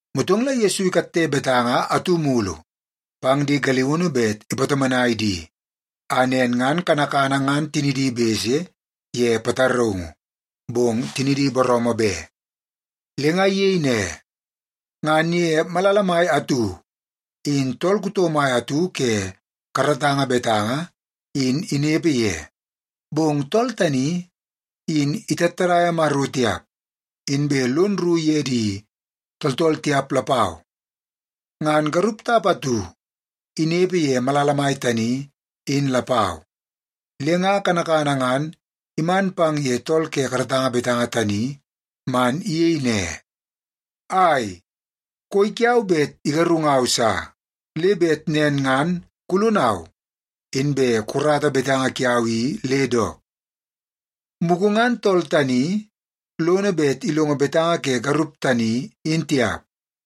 Motong la Yesu ikatte betanga atu mulu pang di galiunu bet ipatomonai di, a nen ngan kanakana ngan tinidi bese ye pataraungu, bong tinidi booroomoo be. Le nga iyei ne, “Ngan ye malala mai atu, in tool kuto mai atu ke karatanga betanga in inepe ye. Bong tool tani, in itattadaia Maro tiap, inbe lono rru ye di tooltool tiap lapau. Ngan garup tap atu inepe ye malala mai tani in lapau, le nga kanakana ngan iman pang ye tool ke karatanga betanga tani man iyei ne, ‘Ai, koi kiau bet igarungau sa, le bet nen ngan kulonau inbe kukarata betanga kiau i le dook.’ “Mugu ngan tool tani lono bet ilongo betanga ke garup tani in tiap,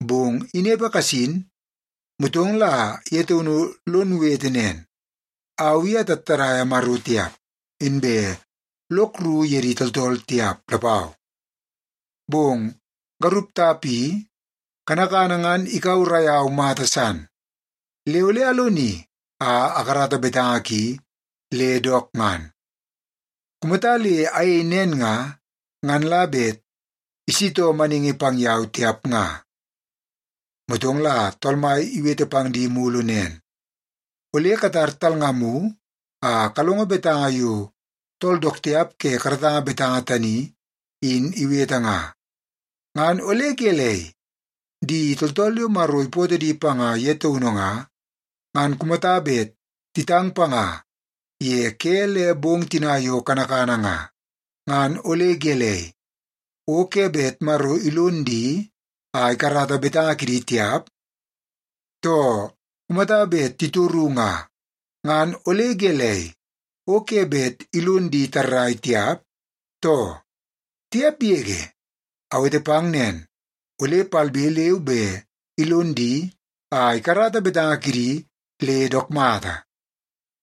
bong inepe kasin, motong la ye taunu lon wete nen, ‘Au i atattadaia Maro tiap, inbe lok rru ye di tooltool tiap lapau, bong garup tap i kanakana ngan ikaurai au mata san. Le ole aloni a akarata betanga ki le dook ngan. Kumata le ayei nen nga, ngan la bet isitoo maningi pang yau tiap nga.’” Motong la Tool Mai iwete pang di mulu nen, “Ole katar talngamu a kalongo betanga yo tool dook tiap ke karatanga betanga tani in iwete nga. Ngan ole gelei? Di tooltool yo Maro ipootoo di panga ye taunu nga, ngan kumata bet titang panga ye ke le bong tina yo kanakana nga, ngan ole gelei, o ke bet Maro ilon di a ikarata betanga kidi tiap? Too, kumata bet titoru nga, ngan ole gelei, o ke bet ilon di tarrai tiap, too? Tiap yege! Awete pang nen, ole palbe leu be ilon di a ikarata betanga kidi le dook mata.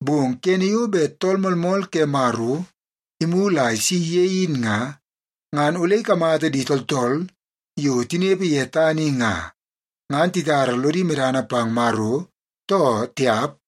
Bong kene yo bet Tool Moolmool ke Maro imulu a isi ye in nga, ngan ole ikamata di tooltool yo tinepe ye tana i nga, ngan titara lodi medana pang Maro, too tiap?”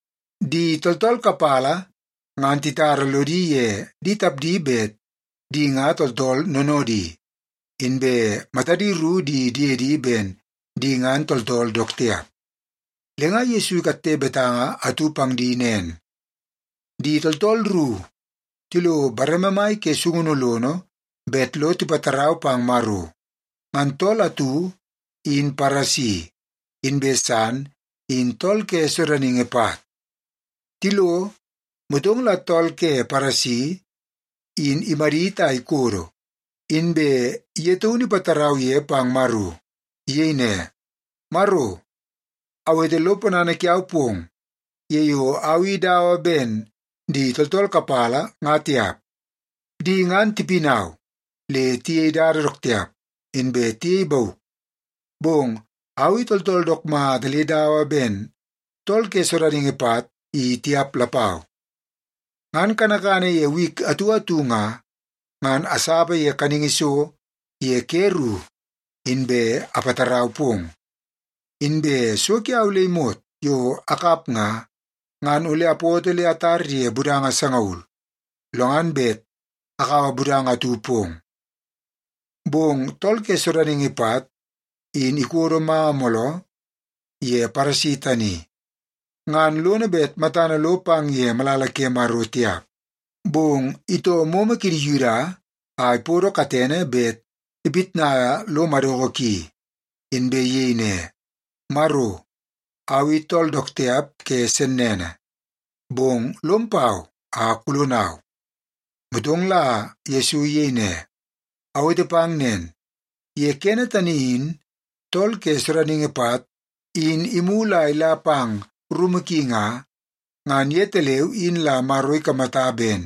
Di tooltool kapala ngan titara lodi ye di tapdi bet di nga tooltool noonoodi, inbe matadi ru di diedi ben di ngan tooltool dook tiap. Le nga Yesu ikatte betanga atu pang di nen, “Di tooltool ru tilo bareme mai ke sungunu lono bet lo tipatarau pang Maro. Ngan tool atu in Paresi, inbe san in tool ke sodaningi pat. Tilo, motong la tool ke Paresi in imadit a ikodo, inbe ye taunu ipatarau ye pang Maro. Iyei ne, ‘Maro, awete lo ponana kiau pong ye yo au i dawa ben di tooltool kapala nga tiap. Di ngan tipinau, le tiyei dada dook tiap, inbe tiyei bauk. Bong au i tool dook mata le dawa ben tool ke sodaningi pat i tiap lapau. Ngan kanakana ye wik atu atu nga, ngan asapa ye kaningi so ye ke ru, inbe apatarau pong. Inbe so kiau le imot yo akap nga, ngan ole apoto le atar ye budanga sangaul, lo ngan bet akaua budanga atu pong.’ “Bong tool ke sodaningi pat in ikodo manga mooloo ye Paresi tani, ngan lono bet matana lo pang ye malala ke Maro tiap. Bong itoo momo kidi Yuda a ipodo katene bet ipitnaia lo madoko ki, inbe iyei ne, ‘Maro, au i tool dook tiap ke sennene, bong lom pau a kulonau.’” Motong la Yesu iyei ne, “Awete pang nen. Ye kene tani in tool ke sodaningi pat in imulu a ila pang rumu ki nga, ngan yetaleu in la Maro ikamata ben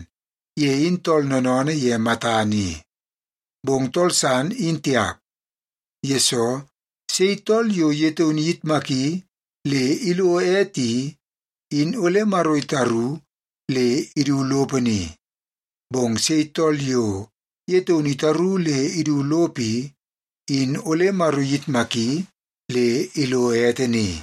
ye in tool noonoonoo ye matana i. Bong tool san in tiap, yesoo sei tool yo ye taunu iyitmaki le ilo ete i, in ole Maro itaru le idu lopo ni. Bong sei tool yo ye taunu itaru le idu lopo i, in ole Maro iyitmaki le ilo ete ni.”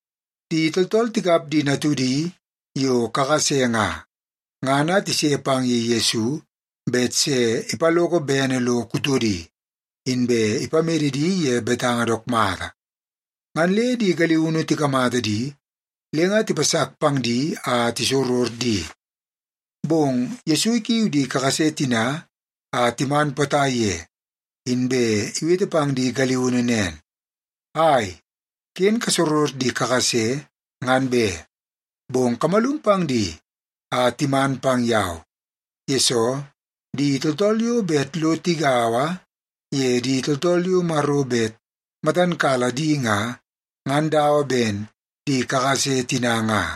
Di tooltool tikap di natudi yo kakase nga, ngan a tise pang ye Yesu bet se ipaloko bene lo kutodi, inbe ipamede di ye betanga dook mata. Ngan le di galiunu tikamata di, le nga tipasak pang di a tisoror di. Bong Yesu ikiu di kakase tina a timan potai ye, inbe iwete pang di galiunu nen, “Ai, ken kasoror di kakase ngan be! Bong kamalum pang di a timan pang yau, yesoo di tooltool yo bet lo tigaua ye di tooltool yo Maro bet matan kala di nga, ngan dawa ben di kakase tina nga.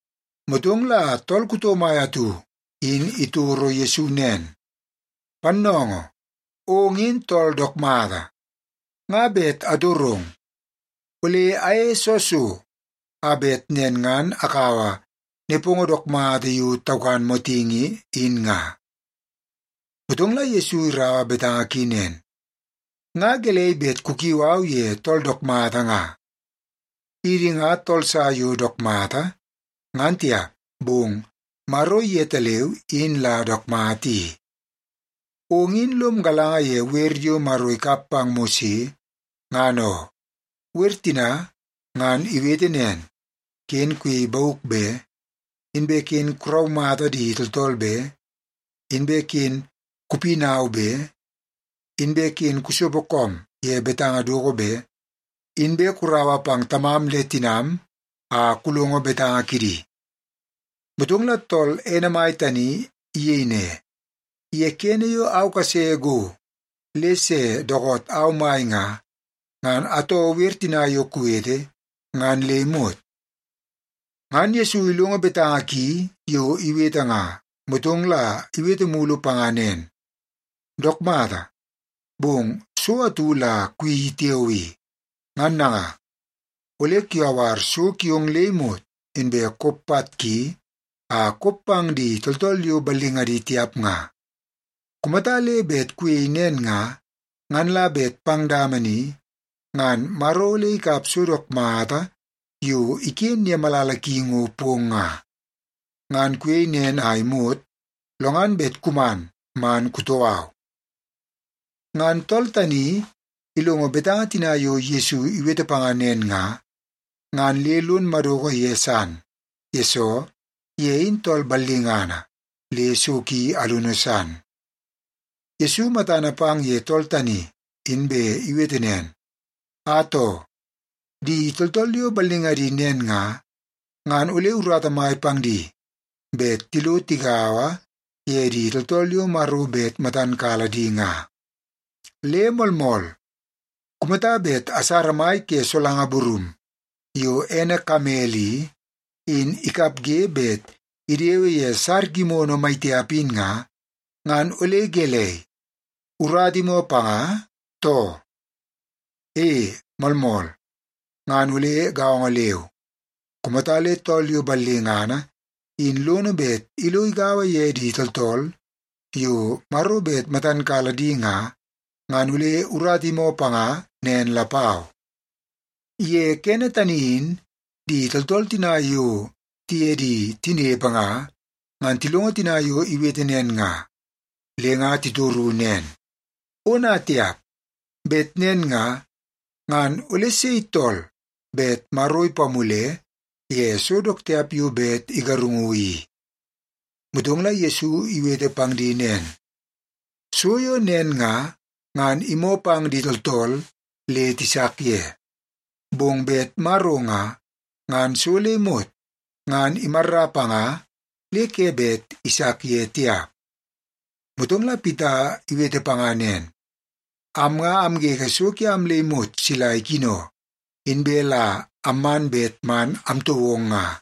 Motong la tool kuto mai atu in itoro Yesu nen, “Pannoongoo, ong in tool dook mata. Nga bet atorong, ole ayeie soo so, a bet nen ngan akaua nepongo dook mata yo taukan motingi in nga?” Motong la Yesu iraua betanga ki nen, “Nga gelei bet kukiu au ye tool dook mata nga? Idi nga tool sa yo dook mata, ngan tiap, bong Maro yetaleu in la dook mata i. Ong in lom galanga ye wer yo Maro ikap pang Mose ngan oo. Wer tina ngan iwete nen: ken kuyei bauk be, inbe ken kuraumata di tooltool be, inbe ken kupinau be, inbe ken kusopo koom ye betanga doko be, inbe kuraua pang tamam le tinam a kulongo betanga kidi.” Motong la tool ene mai tani iyei ne, “Ye kene yo au kase go le se dookoot au mai nga, ngan atoo wer tina yo kuwete ngan le imot.” Ngan Yesu ilongo betanga ki yo iwete nga, motong la iwete mulu panga nen, “Dook mata, bong so atu la kuyeii tiao i. Ngan nanga, ole kuyawar so kiong le imot, inbe kop pat ki a kop pang di tooltool yo ballingadi tiap nga. Kumata le bet kuyei nen nga, ngan la bet pang dama ni ngan Maro ole ikap so dook mata yo iken ye malala ki ngo pong nga. Ngan kuyei nen a imot, lo ngan bet kuman man kutoo au.” Ngan tool tani ilongo betanga tina Yesu iwete panga nen nga, ngan le lon madoko ye san, yesoo ye in tool ballingana le so ki alunu san. Yesu matana pang ye tool tani, inbe iwete nen, “Atoo! Di tooltool yo ballingadi nen nga, ngan ole urata mai pang di bet tilo tigaua ye di tooltool yo Maro bet matan kala di nga. Le moolmool, kumata bet asara mai ke solanga burum yo ene kamel i, in ikapge bet idewe ye sar gimono maitiap in nga, ngan ole gelei, urata imoo panga, too? E, moolmool! Ngan ole gaongo leu, kumata le tool yo ballingana in lono bet ilo igaua ye di tooltool yo Maro bet matan kala di nga, ngan ole urata imoo panga nen lapau.” Ye kene tani in di tooltool tina yo tiye di tinepe nga, ngan tilongo tina yo iwete nen nga, le nga titoru nen, “Ona tiap! Bet nen nga, ngan ole sei tool bet Maro ipamule ye so dook tiap yo bet igarungu i?” Motong la Yesu iwete pang di nen, “So yo nen nga, ngan imoo pang di tooltool le tisak ye. Bong bet Maro nga, ngan so le imot ngan imarra panga le ke bet isak ye tiap.” Motong la Pita iwete panga nen, “Am nga amgege so kiam le imot sila ikino, inbe la amman bet man amtoo ong nga.”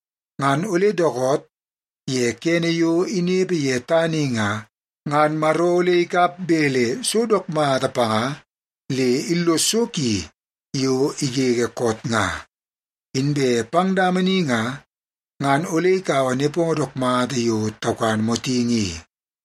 ngan ole dookoot ye kene yo inepe ye tana i nga, ngan Maro ole ikap bele so dook mata panga le illos so ki yo igege koot nga. Inbe pang dama ni nga, ngan ole ikaua nepongo dook mata yo taukan motingi i.”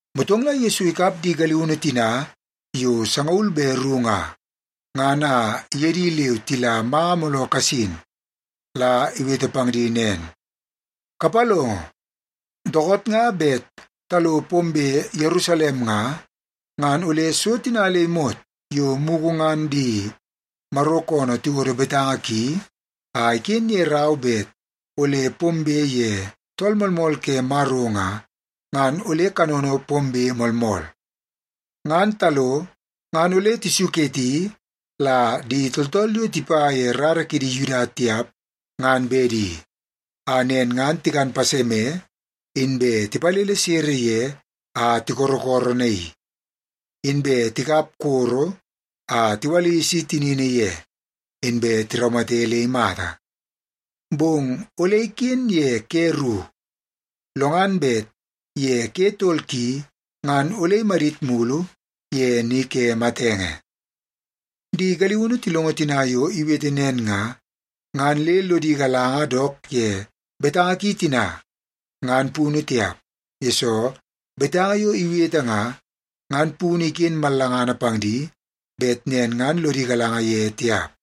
Motong la Yesu ikap di galiunu tina yo sangaul be ru nga, ngan a iye di leu tila manga mooloo kasin la iwete pang di nen, “Kapalongo, dookoot nga bet talo pombe Yerusalem nga, ngan ole so tina le imot yo mugu ngan di Maro koonoo tiwodo betanga ki a iken ye rau bet ole pombe pang ye Tool Moolmool ke Maro nga, ngan ole kanono pombe moolmool. Ngan talo ngan ole tisuketi la di tooltool yo tipa ye rara kidi Yuda tiap ngan bedi, a nen ngan tikan paseme, inbe tipalele sere ye a tikorokoronaii. Inbe tikap koro a tiwalisi tinini ye, inbe tiraumate le imata. Bong ole iken ye ke ru, lo ngan bet ye ke tol ki ngan ole imadit mulu ye ni ke matenge.” Di galiunu tilongo tina yo iwete nen nga, ngan le lodi galanga dook ye betanga ki tina ngan punu tiap, yesoo betanga yo iwete nga, ngan punu iken mallangana pang di bet nen ngan lodi galanga ye tiap.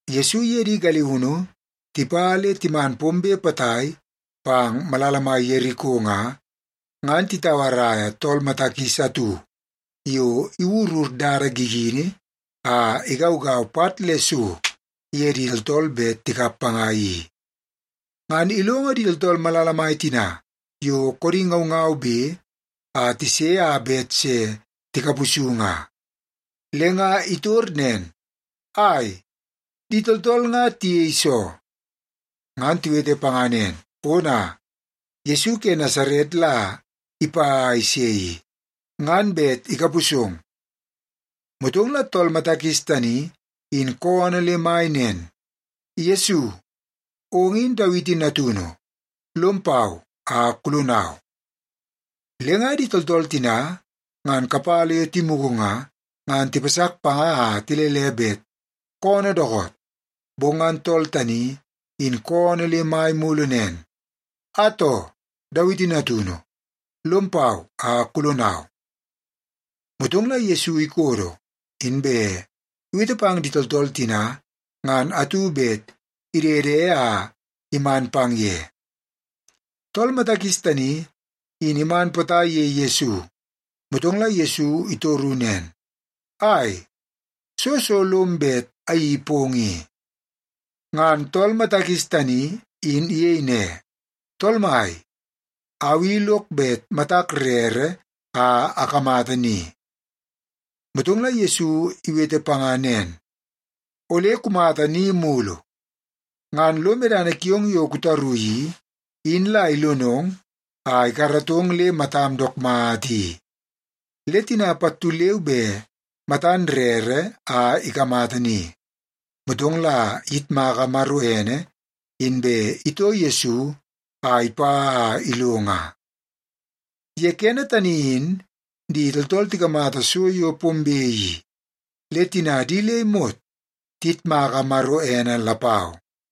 Yesu iye di galiunu tipa le timan pombe potai pang malala mai Yeriko nga, ngan titauarai tool mata kis atu yo iwurur dada gigini a igaugau pat le so ye di tooltool bet tikap panga i. Ngan ilongo di tooltool malala mai tina yo koodi ngaungaube a tise a bet se tikapusu nga. Le nga itor nen, “Ai, di tooltool nga tiyei soo?” Ngan tiwete panga nen, “Ona, Yesu ke Nasaret la ipa a ise i, ngan bet ikapusong.” Motong la tool mata kis tani in koonoo le mai nen, “Yesu, ong in Dawiti natunu. Lom pau a kulonau!” Le nga di tooltool tina ngan kapala yo timugu nga, ngan tipasak panga a tilele bet koonoo dookoot. Bong ngan tool tani in koonoo le mai mulu nen, “Atoo, Dawiti Natunu, lom pau a kulonau!” Motong la Yesu ikodo, inbe iwete pang di tooltool tina ngan atu bet idede a iman pang ye. Tool mata kis tani in iman potai ye Yesu, motong la Yesu itoru nen, “Ai, soo so lom bet ayeii pong i?” Ngan tool mata kis tani in iyei ne, “Tool Mai, au i lok bet matak rere a akamata ni.” Motong Yesu iwete panga nen, “Ole kumata ni mulu. Ngan lo medana kiong yo kutaru i, in la ilonong a ikaratong le matam dook mata i.” Le tina pattu leu be matan rere a ikamata ni, motong la iyitmaka Maro ene, inbe itoo Yesu a ipa a ilo nga. Ye kene tani in di tooltool tikamata so yo pombe i, le tina di le imot tiyitmaka Maro ene lapau.